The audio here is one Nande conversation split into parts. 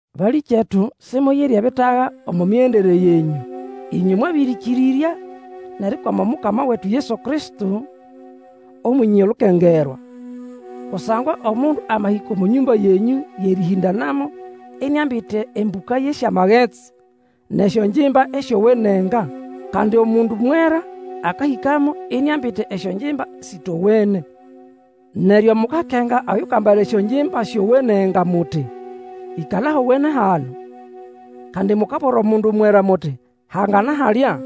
Balĩkyetu, Simuyire ebitaga omo migendere yenyũ, ĩnywe mwabĩrĩkĩrĩrya nʼerikwama Omukama wetu Yesu Kristo, Omwenye olukengerwa. Kusangwa omundu amahĩka omo nyũmba yenyũ yʼerĩhĩndanamo iniambite embũka yʼesyamagetsi, nʼesyongimba esyowenenga. Kandi omundu mwera akahĩkamo iniambite esyongimba sĩtowene. Neryo mukakenga Oyukambala esyongimba syowenenga muti, Ĩkala ahowene hano. Kandi mukabwira omundu mwera, muti, Hangana halya.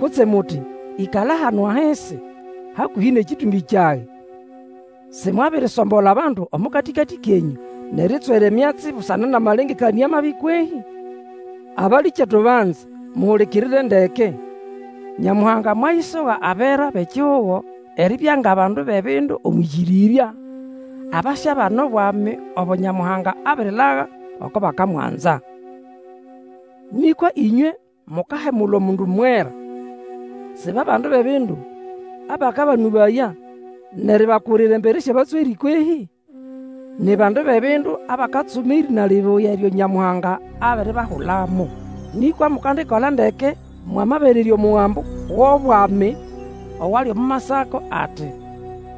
Kutse muti, Ĩkala hano ahisi, hakũhĩ nʼekĩtũmbĩ kyage. Si mwabirisombola abandu omo katĩkatĩ kenyũ, nʼeritswera emyatsi busana nʼamalengekanĩa mabi kwehĩ? Abalĩkyetu banze, muhulikirire ndeke! Nyamuhanga mwayisoga abera bʼekihugo eribya ngʼabandu bʼebindu omwʼĩkĩrĩrya, abasyabana Obwami obo Nyamuhanga abirilaga oko bakamwanza. Nĩkwa ĩnywe mukahemula omundu mwera! Si ba bandu bʼebindu abakabanũbaya, nʼeribakurira embere syʼabatswerĩ kwehĩ? Ni bandu bʼebindu abakatsuma erĩna libuya eryo Nyamuhanga abiribahulamo. Nĩkwa mukandikola ndeke mwamaberererya omugambo wʼobwami owali omo masako ati,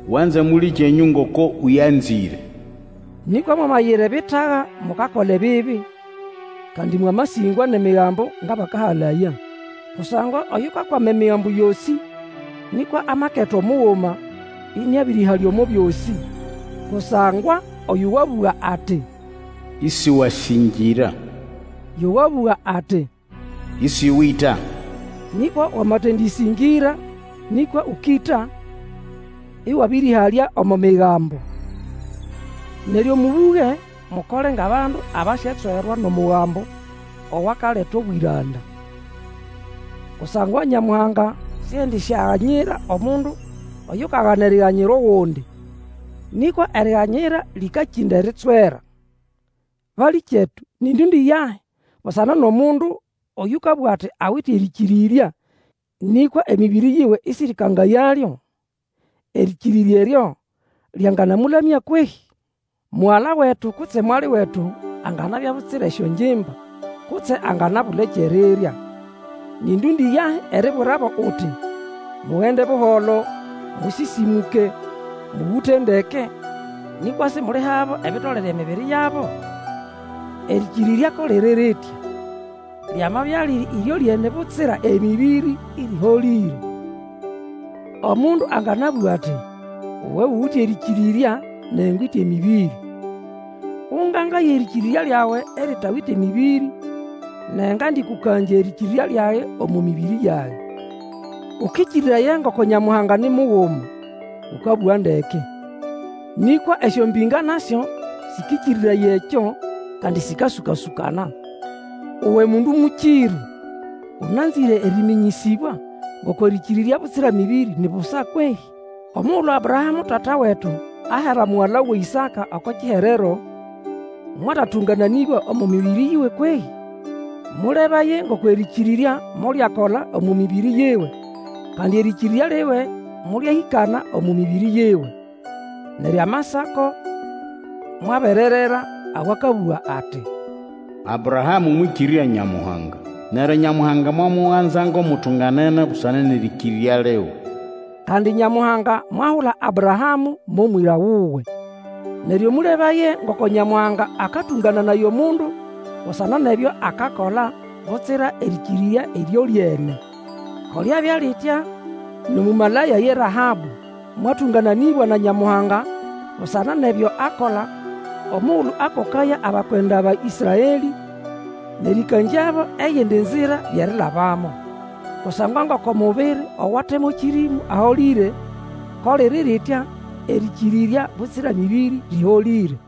Wanze mũlĩkyenyũ ngoko ũyanzĩre. Nĩkwa mwamayira ebitaga, mukakola ebibi, kandi mwamasĩngwa nʼEmigambo ngʼabakahalaya. Kusangwa oyukakwama Emigambo yosĩ, nĩkwa amaketa omuguma, ĩnĩabĩrĩhalya omo byosĩ. Kusangwa oyo wabũga ati, Isiwasĩngĩra, yo wabuga ati, Ĩsĩwĩta. Nĩkwa wamatendĩsĩngĩra, nĩkwa Ũkĩta, ĩwabĩrĩhalya omo Migambo. Neryo mũbũge, mukole ngʼabandu abasyatswerwa nʼomugambo owakaleta obwĩranda. Kusangwa Nyamuhanga siendisyaganyira omundu oyukagana eriganyira ogundi. Nĩkwa eriganyira lĩkakĩnda eritswera. Balĩkyetu, nĩ ndũndĩ yahi busana nʼomundu oyũkabũga ati awite erĩkĩrĩrya, nĩkwa emĩbĩrĩ yiwe isĩrĩkangayalyo. Erĩkĩrĩrya eryo lyanganamũlamya kwehĩ? Mugala wetu kutse mwali wetu anganabya butsira esyongimba, kutse anganabula ekyʼerirya. Nĩ ndũndĩ yahi eribwirabo uti, Mugende buholo, mũsĩsĩmũke, mũgũte ndeke, nĩkwa simulihabo ebitolere emibiri yabo? Erĩkĩrĩrya ko liri ritya. Lyamabya liri ĩryolyene butsira emĩbĩrĩ, ĩrĩholĩre. Omundu anganabũga ati, Uwe uwite erĩkĩrĩrya, nage ngwite emĩbĩrĩ. Ũngangaye erĩkĩrĩrya lyawe eritawite mĩbĩrĩ, nage ngandĩkũkangya erĩkĩrĩrya lyage omo mĩbĩrĩ yage. Ũkĩkĩrĩraya ngoko Nyamuhanga ni muguma. Ũkabũga ndeke. Nĩkwa esyombĩnga nasyo sĩkĩrĩrĩraya ekyo, kandi sĩkasũka-sũkana. Uwe mundu mũkĩrũ, ũnanzĩre erĩmĩnyĩsĩbwa ngoko erĩkĩrĩrya butsira mĩbĩrĩ ni busa kwehĩ? Omugulu Abrahamũ tata wetu, ahera mugala wuwe Ĩsaka oko kiherero, mwatatũngananĩbwa omo mĩbĩrĩ yiwe kwehĩ? Mũlebaye ngoko erĩkĩrĩrya molyakola omo mĩbĩrĩ yiwe, kandi erĩkĩrĩrya liwe molyahĩkana omo mĩbĩrĩ yiwe. Neryo amasako mwabererera, awakabũga ati, Abrahamũ mwĩkĩrĩrya Nyamuhanga, neryo Nyamuhanga mwamuganza ngʼomutunganene busana nʼerĩkĩrĩrya liwe. Kandi Nyamuhanga mwahula Abrahamũ mo mwĩra wuwe. Neryo mũlebaye ngoko Nyamuhanga akatũngananaya omundu busana nʼebyo akakola, butsira erĩkĩrĩrya ĩryolyene. Ko lyabya litya nʼomũmalaya ye Rahabũ. Mwatũngananĩbwa na Nyamuhanga busana nʼebyo akola omugulu akokaya abakwenda ba Ĩsraelĩ, nʼerĩkangyabo eyindi nzira yʼerilabamo. Kusangwa ngoko mubiri owate mo kĩrĩmũ aholĩre, ko liri litya erĩkĩrĩrya butsira mĩbĩrĩ lĩholĩre.